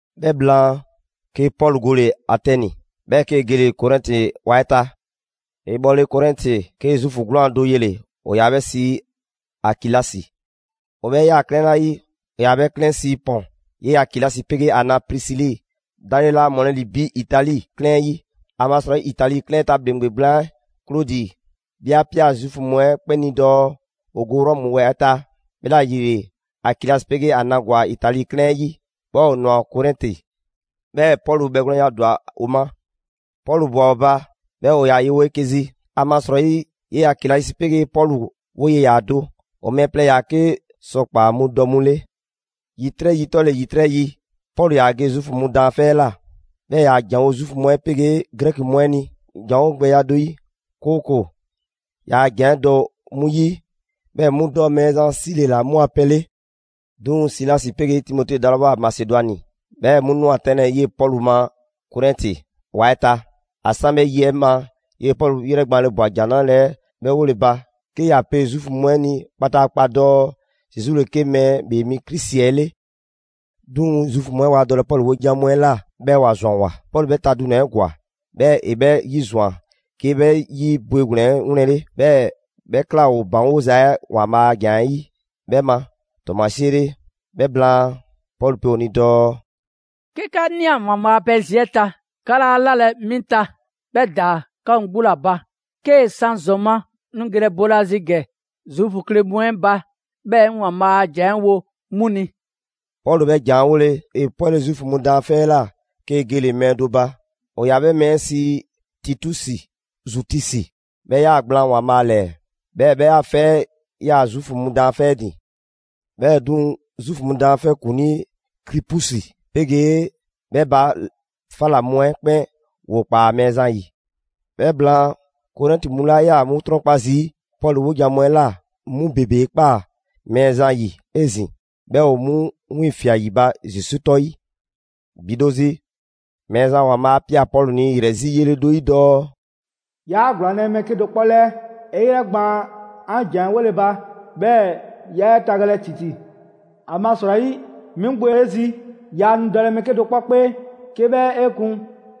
'Bhɛ blaan, 'ke Pɔlu gole‑ Atɛni, 'bhɛɛ‑ 'kee‑ gele‑ Korɛnti ‑wa 'ɛ ta. ‑E bhɔle Korɛnti, 'kee‑ Zuufu 'gwlaan‑ do yele‑, ‑o ‑yaa 'bhɛ sii Akilasi. ‑O 'bhɛ ꞊yaa 'klɛɛn 'la 'yi, ‑o ‑yaa 'bhɛ sii Pɔn. 'Yee‑ Akilasi 'pegee ‑a na Prisili dale laa ‑mɔlɛ' bi Itali 'klɛɛn 'ɛ 'yi. ‑Amasrɔyi Itali 'klɛɛn 'ɛ ta ‑bhleŋgbe gblaan 'ɛ, Klodi, 'bhɛ 'a ꞊pia Zuufu mu 'ɛ 'kpɛn ni dɔɔ ‑o go Rɔmu ‑wa 'ɛ ta. 'Bhɛla‑ ‑yile, Akilasi 'pegee ‑a na ‑gwa Itali 'klɛɛn 'ɛ 'yi, 'bhɛɛ‑ ‑o ꞊nwa Korɛnti. 'Bhɛɛ‑ Pɔlu bhɛgwlɛnya ‑dwa ‑o ma. Pɔlu ꞊bwa ‑o ba, 'bhɛɛ‑ ‑o ‑yaa yewo 'eke‑ zi, ‑amasrɔyi 'yee‑ Akilasi 'pegee Pɔlu 'woye‑ ‑yaa do: ‑O mɛɛ plɛ ‑yaa 'ke sɔkpaa' mu dɔ mu 'le. ‑Yitrɛ' yi 'tɔle‑ ‑yitrɛ' yi, Pɔlu ‑yaa ge Zuufu mu daanfɛ' 'ɛ ꞊la, 'bhɛɛ‑ ‑e ‑yaa ‑janwo' Zuufu mu 'ɛ 'pegee Grɛki mu 'ɛ ni ‑janwo' gbɛya do 'yi, 'kooko‑ ‑yaa ‑jan 'ɛ dɔ 'mu 'yi 'bhɛɛ‑ 'mu dɔ Mɛɛzan 'sile‑ ‑la 'mu a pɛ 'le. 'Duŋ‑ Silasi 'pegee Timote dalawoa Masedwani, 'bhɛɛ‑ 'mu ꞊nwa 'tɛnlɛ‑ 'yee‑ Pɔlu ma Korɛnti ‑wa 'ɛ ta, ‑a 'san 'bhɛ yi 'ɛ ma, 'yee‑ Pɔlu ‑yrɛ gbaanle ꞊bwa ‑Jan 'Nrale‑ 'ɛ 'bhɛɛ‑ 'wole‑ ba, 'ke ‑ya pe Zuufu mu 'ɛ ni kpataakpa dɔɔ Zesu ‑le 'ke Mɛɛ ‑Bhee Mi Krisi 'ɛ 'le. 'Duŋ‑ Zuufu mu 'ɛ waa dɔlɛ Pɔlu 'wojan‑ mu 'ɛ ꞊la, 'bhɛɛ‑ ‑wa ‑zwanwoa. Pɔlu 'bhɛ ta dunɛ‑ 'ɛ ‑gwa, 'bhɛɛ‑ ‑e 'bhɛ 'yizwan‑ 'ke 'bhɛ 'yi bwegblɛn‑ 'ɛ 'wlɛnle‑. 'Bhɛɛ‑ 'bhɛ ꞊kla ‑o ‑baŋgoza 'ɛ ‑Waanbhaa' a ‑jan 'ɛ 'yi 'bhɛ ma ‑tɔɔmasie 'le. 'Bhɛ blaan, Pɔlu pe ‑o ni dɔɔ: «'Ke 'ka ꞊nia ‑Waanbhaa' a pɛ zi 'ɛ ta, 'ka 'laa 'lalɛ‑ 'mi ta, 'bhɛ ‑daa 'ka mu 'gbu ‑la ba. 'Kee‑ 'san ‑zɔn ma, 'ŋ nu gelɛ boolazi ‑gɛ Zuufu kle mu 'ɛ ba, 'bhɛɛ‑ 'ŋ ‑Waanbhaa' a ‑jan 'ɛ wo 'mu ni.» Pɔlu 'bhɛ ‑jan 'ɛ 'wole‑, ‑e 'pwɛle‑ Zuufu mu daanfɛ 'ɛ ꞊la, 'kee‑ gele‑ mɛɛ do ba: ‑o ‑yaa 'bhɛ mɛɛ 'ɛ sii Titusi Zutusi. 'Bhɛ ꞊yaa gblaan ‑Waanbhaa' ‑lɛɛ, 'bhɛɛ‑ 'bhɛ a 'fɛ 'ɛ 'yaa‑ Zuufu mu daanfɛ' 'ɛ ‑din. 'Bhɛɛ‑ 'duŋ‑, Zuufu mu daanfɛ' ‑kuŋlii Kripusi 'pegee 'bhɛ ba 'fa ꞊la mu 'ɛ 'kpɛn ‑woo ꞊kpaa Mɛɛzan 'yi. 'Bhɛ blaan, Korɛnti mu 'la ꞊yaa 'mu 'trɔnkpa zii' Pɔlu 'wojan‑ mu 'ɛ ꞊la, 'mu ‑bebe 'e ꞊kpaa Mɛɛzan 'yi 'ezin‑ 'bhɛɛ‑ ‑o 'mu wiiŋfia꞊ ‑yi ba Zesu 'tɔ 'yi. ‑Bi do zi, Mɛɛzan ‑Waanbhaa' 'a ꞊pia Pɔlu ni ‑yrɛ zi yele do 'yi dɔɔ: «'Yaa ‑gblaanlɛ' mɛɛ 'kedo‑ 'kpɔ 'lɛɛ, 'e 'yrɛ gbaan 'an ‑jan 'ɛ 'wole‑ ba, 'bhɛɛ‑ 'yaa 'e tagalɛ ‑titi. ‑Amasrɔyi 'mi 'gbu ‑o 'e zi. Yaa nu dɔlɛ mɛɛ 'kedo‑ 'kpɔ 'kpee 'ke 'bhɛ 'e kun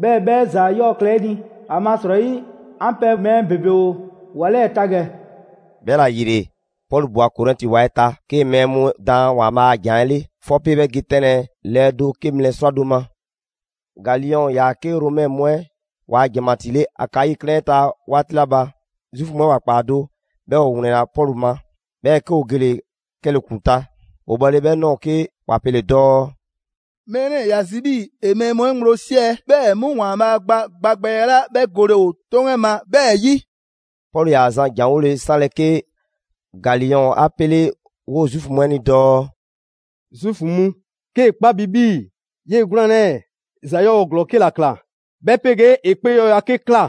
'bhɛɛ‑ 'bhɛ ‑za 'yɔɔ‑ klɛ 'e ni; ‑amasrɔyi 'an pɛ mɛɛ ‑bebe ‑o ‑wa 'lɛɛ‑ ta ‑gɛ.» 'Bhɛla‑ ‑yile, Pɔlu ꞊bwa Korɛnti ‑wa 'ɛ ta, 'kee‑ mɛɛ mu 'ɛ daan ‑Waanbhaa a ‑jan 'ɛ 'le, 'fɔpe 'bhɛ ge 'tɛnlɛ‑ lɛɛ do 'ke mlɛ 'srwado‑ ma. Galiyɔn ‑yaa 'ke Romɛ mu 'ɛ ‑waa' ‑janmatii 'le Akayi 'klɛɛn 'ɛ ta 'waati 'la ba, Zuufu mu 'ɛ ‑wa ꞊kpaa do 'bhɛɛ‑ ‑o ‑wlɛnna Pɔlu ma. 'Bhɛɛ‑ 'ke ‑o gele‑ 'kɛle‑ ‑klu ta. ‑O bhɔle 'bhɛ ꞊nɔɔ, 'ke ‑wa pele‑ dɔɔ: «Mɛɛ 'lɛɛ‑ ‑ya zi 'bhii‑ ‑e mɛɛ mu 'ɛ ŋgblo 'siɛ‑, 'bhɛɛ‑ 'mu ‑Waanbhaa' gba gba gbɛya 'la 'bhɛ gole ‑o 'toŋ 'ɛ ma 'bhɛɛ‑ 'yi.» Pɔlu ‑yaa zan ‑janwole 'sanlɛ‑ 'ke Galiyɔn 'a 'pele 'woo‑ Zuufu mu 'ɛ ni dɔɔ: «Zuufu mu, 'kee‑ 'kpa bi 'bhii‑ 'yee‑ 'gwlaan‑ 'lɛɛ‑ ‑za 'yɔɔ‑ ‑glɔɔ 'ke ‑la ꞊kla, 'bhɛ 'pegee ‑e 'kpee 'yɔɔya‑ 'ke ꞊kla,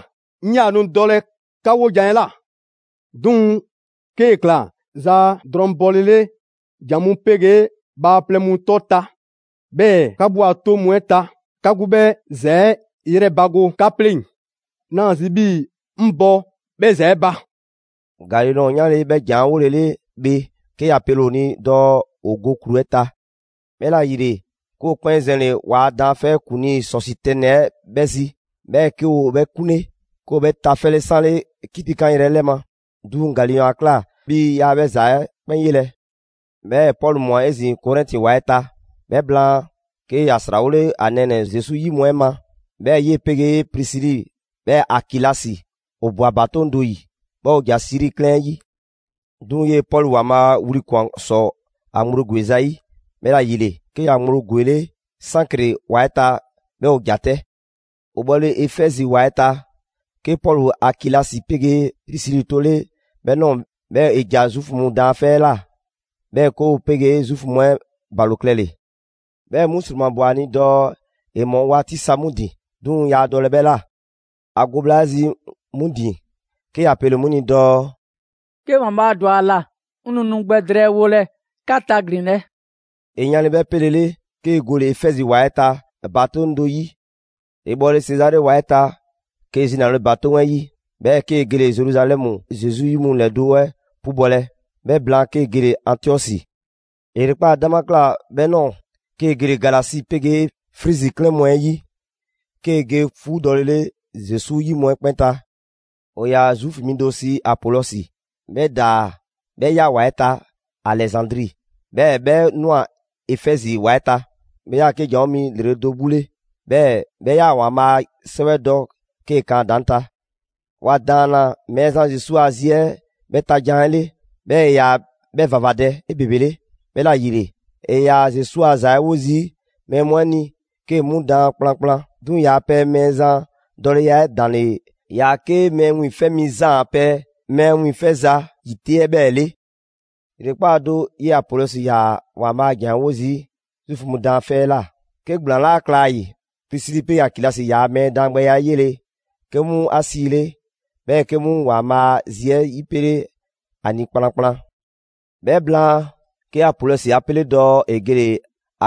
'ŋ 'yaa‑ nu dɔlɛ 'ka 'wojan‑ 'ɛ ꞊la. 'Duŋ‑ 'kee‑ ꞊kla zaa drɔŋ bɔlele ‑jan mu 'pegee bhaaplɛŋ mu 'tɔ ta, 'bhɛɛ‑ 'ka 'gbu a 'toŋ mu 'ɛ ta, 'ka 'gbu 'bhɛ ‑za 'ɛ 'yrɛbago 'ka 'pleŋ. 'Naa‑ zi 'bhii‑ 'ŋ bɔ 'bhɛ ‑za 'ɛ ba!» Galiyɔn 'yanle‑ 'bhɛ ‑jan 'ɛ 'wolele bhe, 'ke ‑ya pele‑ ‑o ni dɔɔ ‑o go ‑klu 'ɛ ta. 'Bhɛla‑ ‑yile, 'ke ‑o 'kpɛn zɛnle‑ ‑waa' daanfɛ' ‑kuŋlii Sɔsitɛni 'ɛ 'bhɛ zi, 'bhɛɛ‑ 'ke ‑o 'bhɛ 'kunle. 'Ke ‑o 'bhɛ tafɛle 'sanle 'kitikanyrɛ 'ɛ 'lɛ ma. 'Duŋ‑ Galiyɔn 'a ꞊kla 'bhii‑ yaa 'bhɛ ‑za 'ɛ 'kpɛn 'yelɛ‑. 'Bhɛɛ‑ Pɔlu ꞊mwa 'ezin‑ Korɛnti ‑wa 'ɛ ta. 'Bhɛ blaan, 'ke ‑ya ‑srawole ‑a nɛɛnɛ‑ Zesu 'yi mu 'ɛ ma. 'Bhɛɛ‑ 'yee‑ 'pegee Prisili, 'bhɛɛ‑ Akilasi ‑o ꞊bwa ‑batoŋ' do 'yi, 'bhɛɛ‑ ‑o ‑ja Siri 'klɛɛn 'ɛ 'yi. 'Duŋ‑ 'yee‑ Pɔlu ‑Waanbhaa' wli ꞊kwan ‑sɔ ‑a ŋgblo ‑gweza' 'yi, 'bhɛla‑ ‑yile 'ke ‑ya ŋgblo ‑gwele' Sankre ‑wa 'ɛ ta, 'bhɛɛ‑ ‑o ‑ja 'tɛ. ‑O bhɔle Efɛzi ‑wa 'ɛ ta, 'ke Pɔlu Akilasi 'pegee Prisili 'tole 'bhɛ ꞊nɔɔ, 'bhɛɛ‑ ‑e ‑ja Zuufu mu daanfɛ' 'ɛ ꞊la 'bhɛɛ‑ 'ke ‑o 'pegee Zuufu mu 'ɛ ‑o ‑balo klɛle‑. 'Bhɛ mu ‑sromabwa ‑a ni dɔɔ ‑e ‑mɔ 'waati sa 'mu ‑din, 'duŋ‑ yaa dɔlɛ 'bhɛ ꞊la. ‑A go bhla 'ɛ zi 'mu ‑din, 'ke ‑ya pele‑ 'mu ni dɔɔ: «'Ke ‑Waanbhaa' ‑dwa ‑a ‑la 'ŋ nu nu gbɛ drɛɛwolɛ 'ka taglinlɛ.» ‑E yanle 'bhɛ 'pele‑ 'le, 'kee‑ gole‑ Efɛzi ‑wa 'ɛ ta ‑batoŋ' do 'yi. ‑E bhɔle Sezare ‑wa 'ɛ ta, 'kee‑ zinale ‑batoŋ' 'ɛ 'yi, 'bhɛɛ‑ 'kee‑ gele‑ Zeruzalɛmu Zesu 'yi mu ‑lɛdo' 'ɛ 'pubɔlɛ; 'bhɛ blaan 'kee‑ gele‑ Antiɔsi. ‑E ‑yrekpaa' 'dama ꞊kla 'bhɛ ꞊nɔɔ, 'kee‑ gele‑ Galasi 'pegee Frizi 'klɛɛn mu 'ɛ 'yi 'kee‑ ge 'fuudɔlele Zesu zi mu 'ɛ 'kpɛn ta. ‑O ‑yaa Zuufu mi do sii Apolɔsi, 'bhɛ ‑daa 'bhɛ ꞊ya ‑wa 'ɛ ta Alɛzandri, 'bhɛɛ‑ 'bhɛ ꞊nwa Efɛzi ‑wa 'ɛ ta. 'Bhɛ 'yaa‑ 'ke ‑janwo' mi ‑lrele' do 'gbu 'le, 'bhɛɛ‑ 'bhɛ ꞊yaa ‑Waanbhaa' a 'Sɛwɛ 'ɛ dɔ 'kee‑ kan ‑a ‑daŋ' ta. ‑Wa ‑daanna Mɛɛzan Zesu a zi 'ɛ 'bhɛɛ‑ ta jan 'ɛ 'le, 'bhɛɛ‑ ‑e ‑yaa 'bhɛ ‑vavadɛ 'ebebele. 'Bhɛla‑ ‑yile, ‑e ‑yaa Zesu a ‑za 'ɛ 'wo zii' mɛɛ mu 'ɛ ni 'kee‑ 'mu daan kplankplan. 'Duŋ‑ ‑yaa' pɛ Mɛɛzan dɔleya 'ɛ ‑daŋ' ‑le ‑yaa 'ke Mɛɛ Wiiŋfɛ' Mi Zaan a pɛ mɛɛ wiiŋfɛza ‑yi 'te 'ɛ 'bhɛɛ‑ 'le. ‑Yrekpaa' do, 'yee‑ Apolɔsi ‑yaa ‑Waanbhaa' a ‑jan 'ɛ 'wo zii' Zuufu mu daanfɛ' 'ɛ ꞊la 'ke ‑gblaan 'laa kla ‑a ‑yi. Prisili 'pegee Akilasi ‑yaa' mɛɛ daangbɛya 'ɛ 'yele‑, 'ke 'mu 'a 'siile‑, 'bhɛɛ‑ 'ke 'mu ‑Waanbhaa' a zi 'ɛ 'yipele 'a ni kplankplan. 'Bhɛ blaan, 'ke Apolɔsi 'a 'pele dɔɔ ‑e gele‑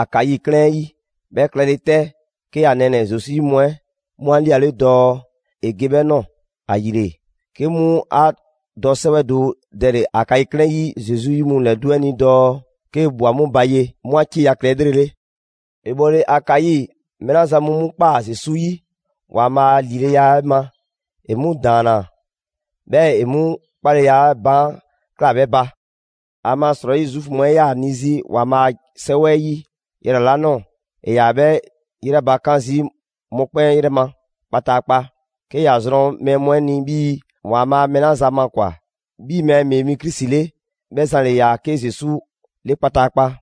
Akayi 'klɛɛn 'ɛ 'yi. 'Bhɛ klɛle 'tɛ, 'ke ‑a nɛɛnɛ‑ Zesu 'yi mu 'ɛ 'mu 'a 'liale dɔɔ ‑e ge 'bhɛ ꞊nɔɔ. ‑Ayile, 'ke 'mu ‑a dɔ 'sɛwɛ do dɛle‑ Akayi 'klɛɛn 'ɛ 'yi Zesu 'yi mu ‑lɛdo' 'ɛ ni dɔɔ 'kee‑ ꞊bhwa 'mu ba ye, 'mu 'a 'cieya‑ klɛ 'elrele. ‑E bhɔle Akayi, mɛɛ 'la zan mu 'mu ꞊kpaa Zesu 'yi ‑Waanbhaa' a ‑lileya 'ɛ ma, ‑e 'mu ‑daanna, 'bhɛɛ‑ ‑e 'mu 'kpaleya 'ɛ baan' ꞊klaa 'bhɛ ba. ‑Amasrɔyi Zuufu mu 'ɛ 'yaa‑ 'ni 'zi ‑Waanbhaa' a 'Sɛwɛ 'yi yrɛ 'la ꞊nɔɔ, ‑e ‑yaa 'bhɛ 'yrɛbakan zii' mɔkpɛn' 'yrɛ ma kpataakpa; 'ke ‑ya zrɔn mɛɛ mu 'ɛ ni 'bhii‑ ‑Waanbhaa mɛɛ 'la zan makwan‑ 'bhii‑ Mɛɛ ‑Bhee Mi Krisi 'le, 'bhɛ zan ‑le ‑yaa 'ke Zesu 'le kpataakpa.